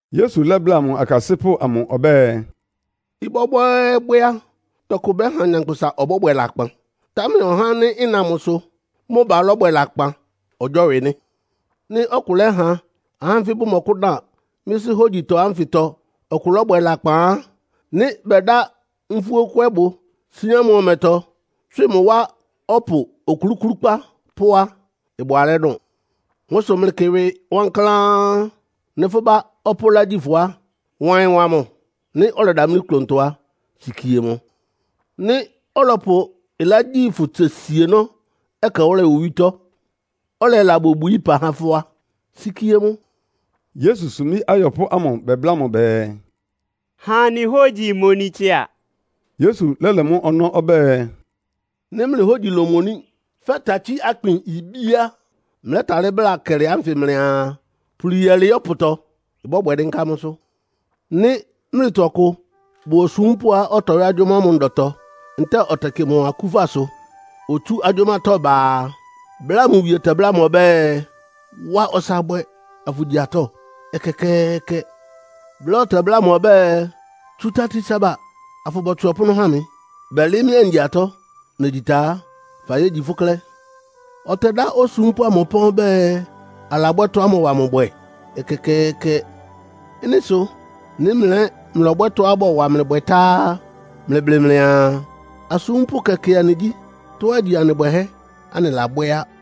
Yesu lɛ́bláa mʋ akasɩ́pʋ́ amʋ ɔbɛ́ɛ, “Ɩbwɛ́bwɛ́ɛ́bwɛ́ á, tɔkʋ bɛ́ha nyankpʋsa ɔbɔ́bwɛ lakpan, támɛ ɔhá ánɩ́ ɩna mʋsʋ mʋ ba lɔ́bwɛ lakpan ɔgyɔ́wɩ nɩ́. Nɩ́ ɔkʋ lɛ́ha ahá ánfɩ bʋmɔkʋ́dan mɩ́sʋ́ hógyitɔ ánfɩtɔ ɔkʋ lɔ́bwɛ lakpan á, nɩ́ bɛda nfúókwɛbʋ síán mʋ ɔmɛtɔ, tswɩ mʋ wá ɔpʋ okluklúkpá pó á, ɩbʋ alɛ́ dʋn. Mʋ́ sʋ mlɩkɩ mlɩ ɩwɩ wankláán. “Nɩ́ fʋ́ bá ɔpʋ́ ɩlá gyi fʋ á, wa ɩyɩn wa mʋ. Nɩ́ ɔlɛdamlí klʋntɔ á, sikie mʋ. Nɩ́ ɔlɔpʋ ɩlá gyi fʋ tse sienɔ́ ɛkɛwʋ́lɛ owítɔ́, ɔlɛla bobwií ɩpa há fʋ́ á, sikie mʋ.” Yesu sumbí ayɔpʋ́ ámʋ bɛbláa mʋ bɛɛ, “Ha anɩ hógyi imoni tsɩa.” Yesu lɛ́lɛ mʋ́ ɔnɔ́ ɔbɛ́ɛ, “Nɩ́ mlɩ hógyi lómoní fɛ́ takyí-akpin ibí á, mlɛ́talɩ́ bláa kɛlɩ ánfɩ mlɩaa, ‘Puli yɛlɩɩ́ ɔpʋtɔ.’ Ɩbɔ́bwɛ dɩ́nká mʋ́sʋ́. “Nɩ́ mlɩtɔ ɔkʋ bʋ osúmpʋ́á ɔtɔyɔ́ agyʋ́má mʋ ndɔtɔ ntɛ́ɛ ɔtɛkɩ mʋ akúfasʋ, otsú agyʋ́mátɔ́ ba a, bláa mʋ wie tɛbláa mʋ ɔbɛ́ɛ, ‘Wa ɔsa bwɛ afʋgyi atɔ́?’ Ɛkɛkɛɛkɛ! Bláa ɔtɛbláa mʋ ɔbɛ́ɛ, ‘Tsu tati saba, afʋbɔtswɩ ɔpʋ́nʋ́ ha mɩ. Bɛlɩɩ́ mɩ́ angyi atɔ́. Negyi ta á, fayégyi fʋ́ klɛ́.’ Ɔtɛdá osúmpʋ́ amʋ ɩpán ɔbɛ́ɛ, alabwɛ́ tɔ́á mɔwa mʋ bwɛ? Ɛkɛkɛɛkɛ! Ɩ́nɩ sʋ nɩ́ mlɩ ɛ́ mlɔbwɛ́ tɔ́á bɔwa mlɩ bwɛ tá á, mlɩblɩ mlɩaa, ‘Asúmpʋ́ kɛkɛ anɩgyí. Tɔ́á igyi anɩ bwɛhɛ́ anɩlabwɛ́ á.’”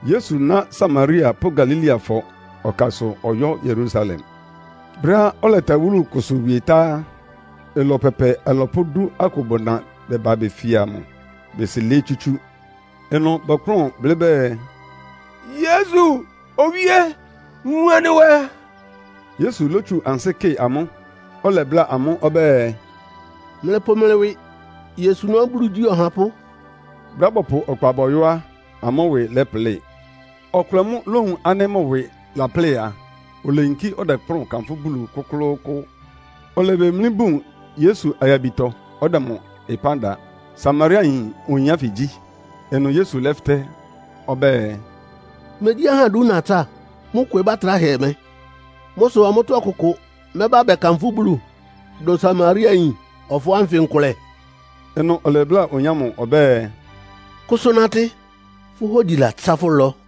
Yesu ná Samaria pʋ́ Galileafɔ ɔkasʋ ɔyɔ́ Yerusalem. Brɛ́á ɔlɛta wúlu kʋsʋ wie tá á, ɩlɔ pɛpɛ alɔpʋ́ dú akʋ bʋna bɛbá befia mʋ, besi lɩɩ́ tsútsú. Ɩnʋ bɔkplʋ́n blɩ́ bɛɛ, “Yesu! Owíé! Wun anɩ nwɛ.” Yesu lótsu ansɩ́ kɩ amʋ́, ɔlɛbláa amʋ́ ɔbɛ́ɛ, “Mlɩpʋ mlɩ ɩwɩ yosuná Bulu igyí ɔhapʋ́.” Brɛ́á bɔpʋ ɔkpa bɔyɔ́ á, amʋ́ ɩwɩ lɛ́plɩ. Ɔkʋlɛ mʋ́ lówun ánɩ́ mʋ ɩwɩ laplɩ́ɩ a, oleyinkí ɔdɛkplʋ́n kanfʋ́ Bulu kʋ́klʋ́kʋ́ʋ́. Olebemlí bún Yesu ayabitɔ, ɔdɛ mʋ ɩpán da. Samariayin oyin ánfɩ gyí. Ɩnʋ Yesu lɛ́fɩtɛ́ ɔbɛ́ɛ, “Megyí ahá idú natsá? Mʋ́ kwebá atráhɛ mɛ́? Mʋ́ sʋ amʋ́tɔ́ ɔkʋkʋ mɛ́ba bɛkanfʋ́ Bulu dʋn Samariayin ɔfɔɔ́ ánfɩ nkʋlɛ?” Ɩnʋ ɔlɛbláa oyin ámʋ ɔbɛ́ɛ, “Kʋsʋ natɩ. Fʋ́ hógyi latsá fʋ́ ɩlɔ.”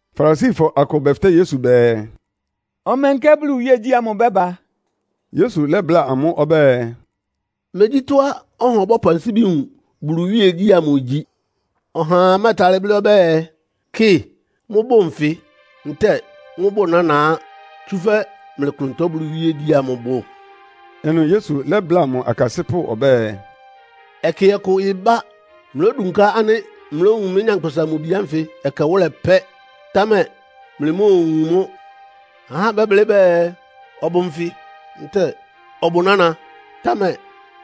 Farisifɔ akʋ bɛfɩtɛ́ Yesu bɛɛ, “Ɔmɛnkɛ Bulu iwíegyí ámʋ ɩbɛ́ba?” Yesu lɛ́bláa amʋ́ ɔbɛ́ɛ, “Megyí tɔ́á ɔha ɔbɔ́pʋ ansíbi wun Bulu iwíegyí ámʋ igyi. Ɔhaa mɛ́ɛtalɩ́ blɩ́ ɔbɛ́ɛ, ‘Kɩ, mʋ́bʋ nfɩ.’ Ntɛ́ɛ ‘Mʋ́bʋ nána á.’ Tsúfɛ́ mlɩ klʋntɔ Bulu iwíegyí amʋ bʋ.” Ɩnʋ Yesu lɛ́bláa mʋ akasɩ́pʋ́ ɔbɛ́ɛ, “Ɛkɛ ɔkʋ ɩbá, mlódunká ánɩ́ mlówun mɩ́, Nyankpʋsa-Mʋ-Bi ánfɩ ɛkɛwʋ́lɛ pɛ́, támɛ mlɩmóowun mʋ́. Ahá bɛ́bláa mlɩ bɛɛ, ‘Ɔbʋ nfɩ.’ ntɛ́ɛ ‘Ɔbʋ nána,’ támɛ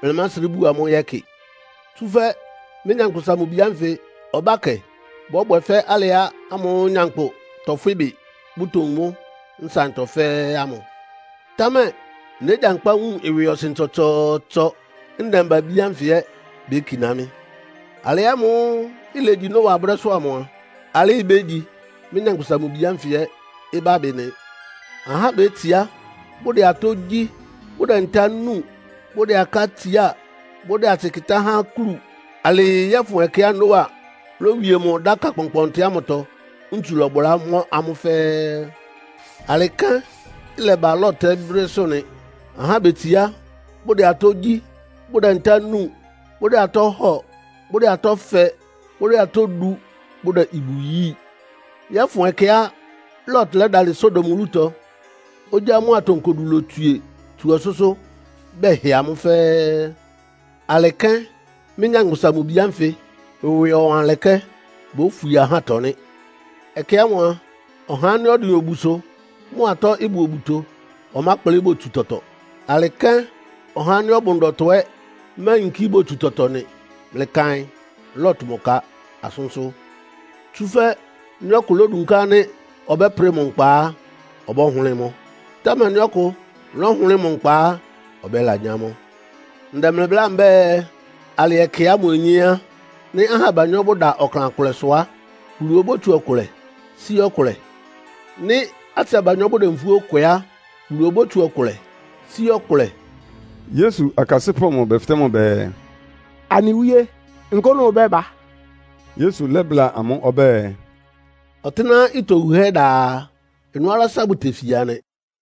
mlɩmásrɩ́ buo amʋ́ yɛ́kɩ. Tsúfɛ́ mɩ́, Nyankpʋsa-Mʋ-Bi ánfɩ ɔbákɛ bɔ́bwɛ fɛ́ alɩ ámʋ́ʋ́ nyankpʋ tɔfwɩ́ ɩbɩ, bʋtowun mʋ́ nsaɩntɔ fɛ́ɛ́ ámʋ. Támɛ négyankpá wun ɩwɩɔsɩn tsɔtsɔɔtsɔ, ndɛmba-abí ánfɩ ɛ́ békiná mɩ́. Alɩ ámʋ́ʋ́ ilegyi Noa brɛ́sʋ́ amʋ a, alɩ́ ibégyi mɩ́, Nyankpʋsa-Mʋ-Bi ánfɩ ɛ́ ɩbábɩ nɩ. Ahá betsiá, bʋdɛ atɔ́ gyí, bʋdɛ ntá núu; bʋdɛ aká tsiá, bʋdɛ atsɩ kɩ́tá há akúlu alɩɩ yɔ́fʋn ɛkɛá Noa lówie mʋ dáka kpɔnkpɔntɩ ámʋtɔ, ntsu lɔ́bʋlá bɔmɔ amʋ́ fɛ́ɛ́. Alɩ kɛ́n ɩlɛba Lot ɛ́ brɛ́sʋ́ nɩ. Ahá betsiá, bʋdɛ atɔ́ gyí, bʋdɛ ntá núu, bʋdɛ atɔ́ hɔ́ɔ, bʋdɛ atɔ́ fɛ; bʋdɛ atɔ́ du, bʋdɛ ibu yíi, yɔ́fʋn ɛkɛá Lot lɛ́dalɩ Sodom wúlutɔ, ogyá mʋ́a atonkodu lotswie tsu ɔsʋ́sʋ́ bɛhɩ amʋ́ fɛ́ɛ́. Alɩ́ kɛ́n mɩ́, Nyankpʋsa-Mʋ-Bi ánfɩ ɩwɩɔwanlɛkɛ́ bófwie ahátɔ nɩ́. “Ɛkɛ ámʋ a, ɔhá ánɩ́ ɔdɩn obusʋ, mʋ atɔ́ ɩbʋ obuto ɔmákplɩ́ botsu tɔtɔ. Alɩ kɛ́n ɔhá ánɩ́ ɔbʋ ndɔtɔ ɛ́ máyinkí botsu tɔtɔ nɩ. Mlɩkaɩn Lot mʋ ka asʋ́nsʋ́! Tsúfɛ́ nɩ́ ɔkʋ lódunká ánɩ́ ɔbɛ́prɩ mʋ nkpa á, ɔbɔ́hʋlɩ́ɩ mʋ́. Támɛ nɩ́ ɔkʋ lɔ́hʋlɩ́ɩ mʋ nkpa á, ɔbɛ́lanyá mʋ́. Ndɛ mlɩ bláa mbɛ́ɛ, alɩ ɛkɛ ámʋ onyé á, nɩ́ ahá abanyɔ́ bʋda ɔklan kʋlɛsʋ á, Bulu obótsu ɔkʋlɛ sí ɔkʋlɛ. “Nɩ́ atsɩ abanyɔ́ bʋdɛ nfúó kwɛ á, Bulu obótsu ɔkʋlɛ sí ɔkʋlɛ.” Yesu akasɩ́pʋ́ amʋ bɛfɩtɛ́ mʋ bɛɛ, “Anɩ Wíe, nkʋ́nʋ́ ɩbɛ́ba?” Yesu lɛ́bláa amʋ́ ɔbɛ́ɛ, “Ɔtɩ́nɛ́á ɩtɔ wuhɛ́ da a, ɩnʋ́ alása bʋtefia nɩ.”